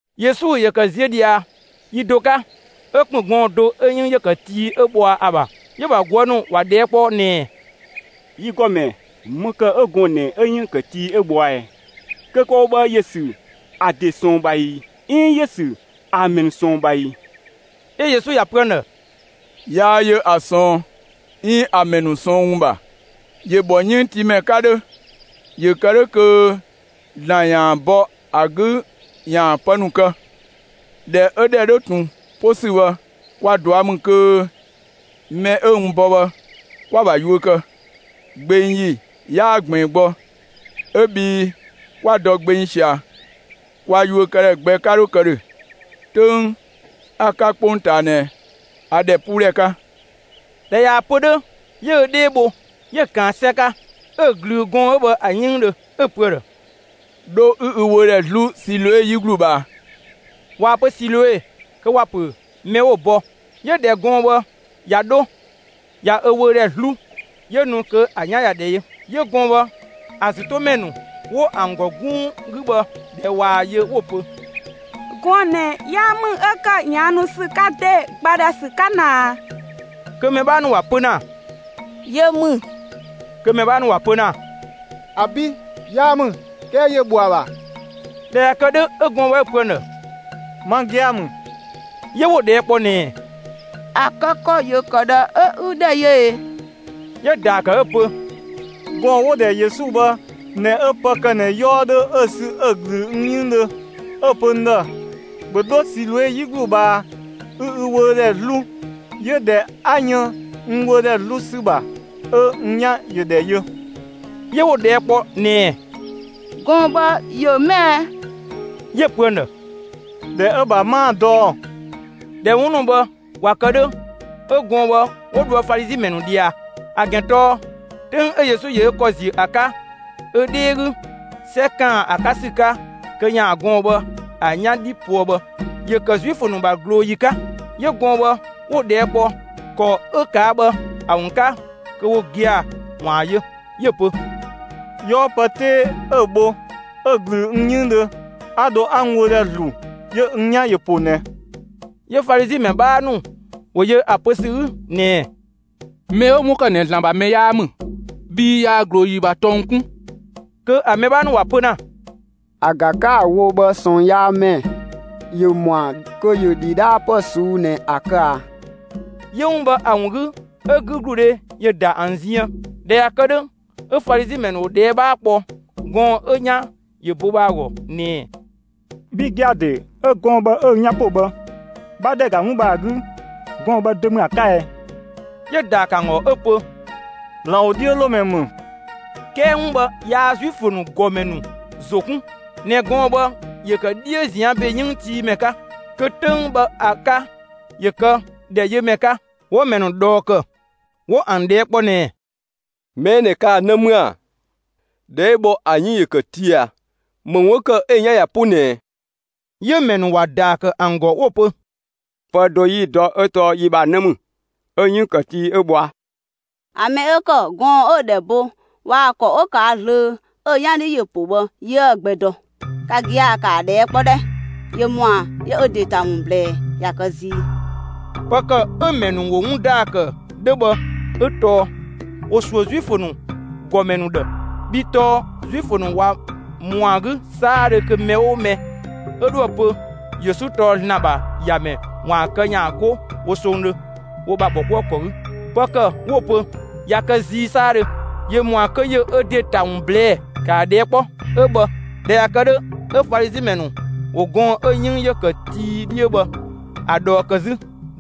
Yesu ‑yö ‑kë ziö ꞊dhia yi do 'ka, 'ö ‑kpën gɔɔn‑ do 'ö‑ 'yënng ‑yö ‑kë tii 'ö bhɔa ‑a ‑bha. 'Yö‑ ‑bha ꞊guë' ‑nu ‑wa ꞊dhɛɛ' kpɔ ꞊nɛɛ: «Yi ‑Gɔmɛ, ‑më ‑kë 'ö gɔɔn‑ ꞊nɛ 'ö‑ 'yënng ‑kë tii 'ö bhɔa ꞊ɛɛ? Kö kë‑ wo bhë, ‑yö ‑sü ‑a ‑de ꞊sɔɔn ‑bha ꞊ii, 'iin ‑yö ‑sü ‑a ‑mɛ ‑nu ꞊sɔɔn ‑bha ꞊ii?» 'Ö Yesu ‑ya pö ‑an ‑dhë: «Yaa yö ‑a ꞊sɔɔn 'iin ‑a ‑mɛ ‑nu ꞊sɔɔn ‑wun ‑bha. ‑Yö ‑bhɔ 'yënngtiimɛ 'ka 'dhö ‑yö kë 'dhö kö ‑Zlan ‑yaan bɔ ‑a 'gü ‑yaan pë ‑nu kë. ꞊Dhɛ 'ö‑ ‑dhɛ 'dhö ꞊tun 'po ‑sü bhë, kwa ꞊dua' ‑mü kö mɛ 'ö n bɔ bhë, kwa‑ ‑bha yuö kë. Gbeng ‑yi 'yaa ꞊gbiin gbɔ, 'ö bhii 'kwa dɔ gbeng ꞊sia, kwa yuökëdhɛ gbɛ 'ka dho kë ‑dhö. 'Töng 'a‑ 'ka 'kpongtaa ꞊nɛ, a ‑dhɛpuudhɛ 'ka.» ꞊Dhɛ ꞊yaa‑ pö 'dhö, 'yö ö 'dhee bho; 'yö‑ ꞊kaan 'sɛ 'ka 'ö‑ ꞊glüü gɔɔn‑ 'ö bhë ‑a 'yënngdhö, 'ö‑ pö ‑a ‑dhë: «'Dho 'ü ü wöödhɛ 'zlu Siloe 'yi ‑glu ꞊bhaa.» (꞊Waa‑ pö Siloe kö ‑wa ‑pö «mɛ 'wo‑ bɔ».) 'Yö ꞊dhɛ gɔɔn‑ bhë ꞊ya 'dho ꞊ya ö wöödhɛ 'zlu, 'yö nu kö ‑a 'yan ꞊ya ‑dhɛ yö. 'Yö gɔɔn‑ bhë ‑a ‑zü 'to mɛ ‑nu 'wo ‑an ‑gɔ 'gunng 'gü bhë, ꞊dhɛ ꞊waa‑ yö, 'wo‑ pö: «Gɔɔn‑ ꞊nɛ 'yaa ‑mü 'ö ‑kë ꞊yaannu ‑sü 'ka ‑de, ‑gba ‑dhɛ ‑sü 'ka ꞊naa?» Kö mɛ 'bhaa ‑nu ‑wa pö ‑na: «Yö ‑mü.» Kö mɛ 'bhaa ‑nu ‑wa pö ‑na: «‑Abi', 'yaa ‑mü; 'kɛɛ ‑yö ‑bhɔ ‑a ‑bha.» ꞊Dhɛ ꞊ya kë 'dhö, 'ö gɔɔn‑ bhë 'ö‑ pö ‑an ‑dhë: «Ma gia‑ ‑mü.» 'Yö 'wo‑ ꞊dhɛɛ' kpɔ ꞊nɛɛ: «‑A kë ‑kɔ ‑yö ‑kë ꞊dhë 'ö 'ü ‑dhɛ yö ꞊ee?» 'Yö‑ ‑daa kë 'ö‑ pö: «Gɔɔn‑ 'wo‑ ‑dhɛ Yesu bhë ꞊nɛ 'ö pë ‑kë ꞊nɛ 'yɔɔ 'dhö 'ö‑ sü 'ö‑ ꞊glüü n 'yënggdhö, 'ö‑ pö n ‑dhë: ‹‑Bhö 'dho Siloe 'yi ‑glu ꞊bhaa 'ü ü wöödhɛ 'zlu›; 'yö ꞊dhɛ 'a yën n wöödhɛ 'zlu ‑sü ‑bha 'ö n 'yan ‑yö ‑dhɛ yö.» 'Yö 'wo‑ ꞊dhɛɛ' kpɔ ꞊nɛɛ: «Gɔɔn‑ bhë, ‑yö 'më ɛɛ?» 'Yö‑ pö ‑an ‑dhë: «‑Dhɛ 'ö‑ ‑bha 'maa‑ dɔ ‑ɔ.» ꞊Dhɛ 'wun ‑nu bhë ꞊wa kë 'dhö, 'ö gɔɔn‑ bhë 'wo dhoë Falizi ‑mɛ ‑nu ꞊dhia. ‑A ‑gɛn tɔɔ 'töng 'ö Yesu ‑yö ö ‑kɔ ‑ziö ‑a 'ka ö 'dhee 'gü 'sɛ ‑kaan ‑a 'ka ‑sü 'ka kö ‑yaan gɔɔn‑ bhë ‑a 'yan 'dhi poë bhë, ‑yö ‑kë Zuifö ‑nu ‑bha ꞊glooyi 'ka. 'Yö gɔɔn‑ bhë 'wo‑ ꞊dhɛɛ' kpɔ ‑kɔ 'ö ꞊kaa' bhë ‑a ‑wun 'ka kö wo gia‑ ‑waan yö. 'Yö‑ pö: «'Yɔɔ pë 'tee 'ö‑ bho 'ö ꞊glüü n 'yënngdhö, 'a dho 'a n wöödhɛ ‑zlu, 'yö n 'yan ‑yö ‑po ꞊nɛ.» 'Yö Falizi ‑mɛ 'bhaa ‑nu ‑wo yö ‑a pö ‑sü 'gü ꞊nɛɛ: «Mɛ 'ö 'wun ‑kë ꞊nɛ ‑Zlan ‑bha mɛ 'yaa ‑mü bhii yaa ꞊glooyi ‑bha tɔng 'kun.» Kö ‑a mɛ 'bhaa ‑nu ‑wa pö ‑na: «‑A ꞊ga 'ka‑ wo bhë ꞊sɔɔnyaamɛ ‑yö ‑mɔa kö ‑yö ‑dhidhaapë ꞊suu'‑ ꞊nɛ ‑a kë ꞊a?» 'Yö 'wun bhë ‑a ‑wun 'gü 'ö 'gügludhe ‑yö ‑da ‑an ziën. ꞊Dhɛ ꞊ya kë 'dhö, 'ö Falizi ‑mɛ ‑nu ‑wo ꞊dhɛɛ' 'bhaa kpɔ gɔɔn‑ 'ö‑ 'yan ‑yö bo bhë ‑a ‑gɔ ꞊nɛɛ: «Bhi gia‑ ‑de 'ö gɔɔn‑ bhë 'ö ü 'yan po bhë, 'bha ‑dhɛ ‑ga 'wun bhë ‑a 'gü, gɔɔn‑ bhë dö ‑mü ‑a 'ka ɛ?» 'Yö‑ ‑daa ‑kë ‑an ‑gɔ 'ö‑ pö: «‑Zlan ‑wodhiölomɛ ‑mü.» 'Kɛɛ 'wun bhë yaa Zuifö ‑nu ‑gɔmɛ ‑nu ‑zo 'kun ꞊nɛ gɔɔn‑ bhë ‑yö kë 'dhiö ꞊zian' ‑be 'yënngtiimɛ 'ka, kö 'töng bhë ‑a 'ka ‑yö kë ‑dhɛ yö ‑mɛ 'ka. 'Wo‑ ‑mɛ ‑nu ꞊dhɔɔ ‑kë; 'wo ‑an ꞊dhɛɛ' kpɔ ꞊nɛɛ: «Mɛ 'ö ꞊nɛ kaa‑ 'në ‑mü ‑a? ꞊Dhɛ 'ö bhɔ bhë ‑a 'yënng‑ ‑kë tii ꞊a? ‑Më ‑wun 'ö ‑kë 'ö‑ 'yan ꞊ya 'po ꞊nɛɛ?» 'Yö‑ ‑mɛ ‑nu ‑wa ‑daa ‑kë ‑an ‑gɔ 'wo‑ pö: «Pë do 'yi‑ dɔ 'ö tɔɔ yi ‑bha 'në ‑mü, 'ö‑ 'yënng ‑kë tii 'ö bhɔa. ‑A mɛ 'ö ‑kë gɔɔn‑ 'ö‑ ‑dhɛ bo waa‑ ‑kɔ 'ö ꞊kaa' zlöö 'ö‑ 'yan 'dhi ‑yö ‑po bhë 'yiëë‑ gbɛ dɔ. Ka gia‑, ‑kaa ꞊dhɛɛ' kpɔ 'dhɛ, ‑yö ‑mɔa ‑yö ö ‑de ‑ta ‑wun ꞊blɛɛ'; ꞊ya kë zii!» Pë ‑kë 'ö‑ ‑mɛ ‑nu ‑wo 'wun ‑daa ‑kë 'dhö bhë, 'ö tɔɔ ‑wo ‑suö Zuifö ‑nu ‑gɔmɛ ‑nu ‑dhë, bhii tɔɔ Zuifö ꞊wa ‑mɔa 'gü 'saadhö kö mɛ 'oo mɛ 'ö 'dhoë‑ pö Yesu tɔɔ ‑Zlan ‑bha ‑Yamɛ ‑waan kë ‑yaan 'go wo songdhö wo ‑bha ‑bhɔkuëkɔ 'gü. Pë ‑kë 'wo‑ pö: «꞊Ya kë zii 'saadhö; ‑yö ‑mɔa kö ‑yö ö ‑de ‑ta ‑wun ꞊blɛɛ'‑; ‑kaa ꞊dhɛɛ' kpɔ!» 'ö bhë. ꞊Dhɛ ꞊ya kë 'dhö, 'ö Falizi ‑mɛ ‑nu ‑wo gɔɔn‑ 'ö‑ 'yënng ‑yö ‑kë tii 'dhiö bhë ‑a ꞊dhɔɔ ‑kë 'zü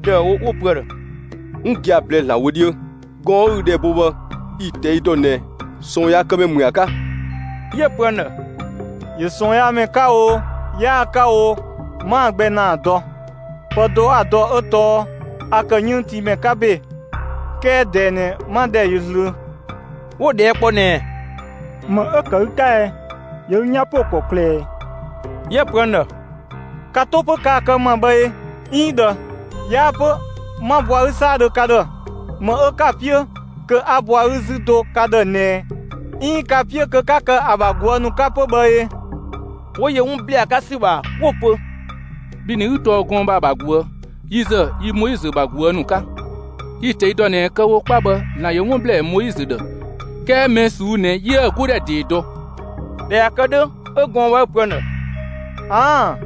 ‑dëüwo 'wo‑ pö ‑a ‑dhë: «'Wun gia‑ ꞊blɛɛ'‑ ‑Zlan wö 'dhiö; gɔɔn‑ 'ö ü ‑dhɛ bo bhë yi‑ ꞊tɛi' ‑dɔ ꞊nɛ ꞊sɔɔnyaakëmɛ ‑mü ‑a 'ka.» 'Yö‑ pö ‑an ‑dhë: «‑Yö ꞊sɔɔnyaamɛ 'ka oo, 'yaa‑ 'ka oo, 'maa‑ gbɛ ‑naa dɔ. Pë do 'a‑ dɔ 'ö tɔɔ a ‑kë 'yënngtiimɛ 'ka ‑be, 'kɛɛ ꞊dɛɛ ꞊nɛ 'ma ‑dhɛ ‑yö zlöö.» 'Wo‑ ꞊dhɛɛ' kpɔ ꞊nɛɛ: «‑Më 'ö‑ ‑kë ü 'ka ɛɛ? ‑Yö ü 'yan ‑po ‑kɔklë ꞊ɛɛ?» 'Yö‑ pö ‑an ‑dhë: «Ka 'to 'pö kaa‑ kë n ‑ma bhë ꞊ee, 'iin ꞊dhë, 'yaa 'pö 'ma bɔ ‑a 'gü 'saadhö ka ‑dhë. ‑Më 'ö 'ka‑ 'piö kö 'a bɔ ‑a 'gü 'zü do ka ‑dhë ꞊nɛɛ 'iin 'ka‑ 'piö kö 'ka kë ‑a ‑bha ꞊guë' ‑nu 'ka 'pö bhë ee?» 'Wo yö 'wun ‑blɛɛ ‑a 'ka ‑sü ‑bha 'wo‑ pö: «Bhi ꞊nɛ 'ü tɔɔ gɔɔn‑ bhë ‑a ‑bha ꞊guë'. Yi ‑zë yi Moizö ‑bha ꞊guë' ‑nu 'ka. Yi‑ ꞊tɛi' dɔ ꞊nɛ kë‑ wo 'kpa bhë, ‑Zlan ‑yö 'wun ‑blɛɛ Moizö ‑dhë; 'kɛɛ mɛ ꞊suu'‑ ꞊nɛ 'yiëë‑ 'godhɛ ‑dee dɔ!» ꞊Dhɛ ꞊ya kë 'dhö, 'ö gɔɔn‑ bhë 'ö‑ pö ‑an ‑dhë: «꞊Aan'‑,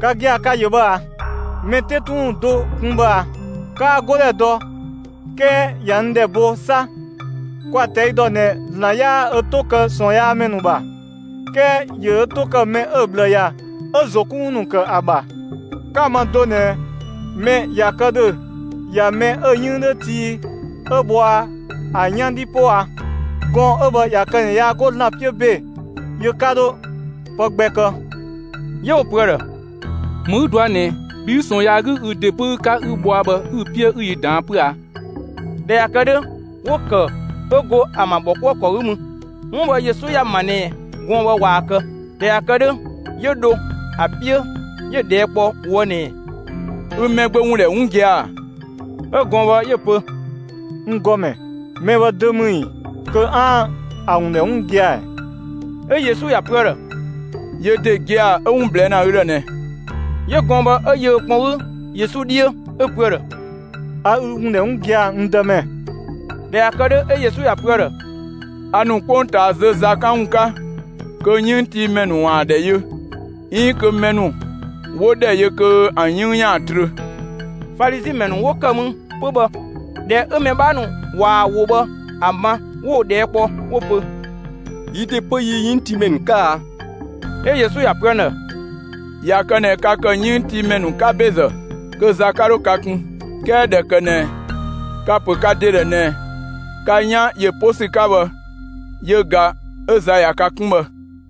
ka gia‑ ka‑ ‑yö bhë ꞊aa! Mɛ 'te 'tun ‑wun do kun bhë ꞊a; 'kaa‑ 'godhɛ dɔ, 'kɛɛ ꞊ya n ‑dhɛ bo 'sa! Kwa‑ ꞊tɛi' dɔ ꞊nɛ ‑Zlan 'yaa ö 'to kë ꞊sɔɔnyaamɛ ‑nu ‑bha, 'kɛɛ ‑yö ö 'to ‑kë mɛ 'ö‑ ꞊bhlë ‑ya, 'ö‑ ‑zo 'kun ‑wun ‑nu ‑kë ‑a ‑bha. 'Ka‑ ma do ꞊nɛ mɛ ꞊ya kë ‑dhö ꞊ya mɛ 'ö 'yënng 'dhö tii 'ö bhɔa ‑a 'yan 'dhi 'po ꞊a? Gɔɔn‑ 'ö bhë ꞊ya kë ꞊nɛ yaa 'go ‑Zlan 'piö ‑be, yö 'ka 'dho pë gbɛ kë.» 'Yö 'wo‑ pö ‑a ‑dhë: «‑Më 'ü dɔa ꞊nɛɛ, bhi 'ü ꞊sɔɔn yaa 'gü ü ‑de 'böü 'ka 'ü bhɔa bhë, ü‑ 'piö 'ü yi ꞊daan'‑ 'pö a?» ꞊Dhɛ ꞊ya kë 'dhö, 'wo‑ ‑kë 'ö go ‑an ‑bha ‑bhɔkuëkɔ 'gü mü. 'Wun bhë Yesu ‑ya ‑ma ꞊nɛ gɔɔn‑ bhë ꞊waa‑ kë. ꞊Dhɛ ꞊ya kë 'dhö, 'yö dho ‑a 'piö 'yö‑ ꞊dhɛɛ' kpɔ ꞊woë' ꞊nɛɛ: «Ü Mɛgbö ‑wun ‑dhɛ 'wun gia‑ ‑a?» 'Ö gɔɔn‑ bhë 'yö‑ pö: «N ‑Gɔmɛ, mɛ bhë dö ‑mü ‑ii kö 'aan‑ ‑a ‑wun ‑dhɛ 'wun gia‑ ‑ɛ?» 'Ö Yesu ‑ya pö ‑a ‑dhë: «Yö ‑de gia‑ 'ö 'wun ꞊blɛɛ' ‑na ü ‑dhë ꞊nɛ!» 'Yö gɔɔn‑ bhë 'ö yö ö kpɔn 'gü Yesu 'dhiö, 'ö‑ pö ‑a ‑dhë: «A ü ‑wun ‑dhɛ 'wun gia‑, n Dëmɛ.» ꞊Dhɛ ꞊ya kë 'dhö, 'ö Yesu ‑ya pö ‑a ‑dhë: «A ‑nu 'kpongtaa zö za 'kan ‑wun 'ka, kö 'yënngtiimɛ ‑nu ‑waan ‑dhɛ yö, 'iin kö mɛ ‑nu 'wo ‑dhɛ yö kö ‑an 'yënng ‑yaan trö.» Falizi ‑mɛ ‑nu 'wo ‑kë mü 'pö bhë, ꞊dhɛ 'ö‑ mɛ 'bhaa ‑nu ꞊waa‑ ‑wo bhë ‑a ma, 'wo‑ ꞊dhɛɛ' kpɔ, 'wo‑ pö: «Yi ‑de 'pö yi 'yënngtiimɛ ‑nu 'ka a?» 'Ö Yesu ‑ya pö ‑an ‑dhë: «꞊Ya kë ꞊nɛ ka ‑kë 'yënngtiimɛ ‑nu 'ka ‑bezë kö za 'ka 'dho ka kun; 'kɛɛ ꞊dhɛ ‑kë ꞊nɛ ka‑ ‑pö ka ‑de ‑dhë ꞊nɛ ka 'yan ‑yö 'po ‑sü 'ka bhë, yö ꞊ga 'ö za ꞊ya ka kun bhë.»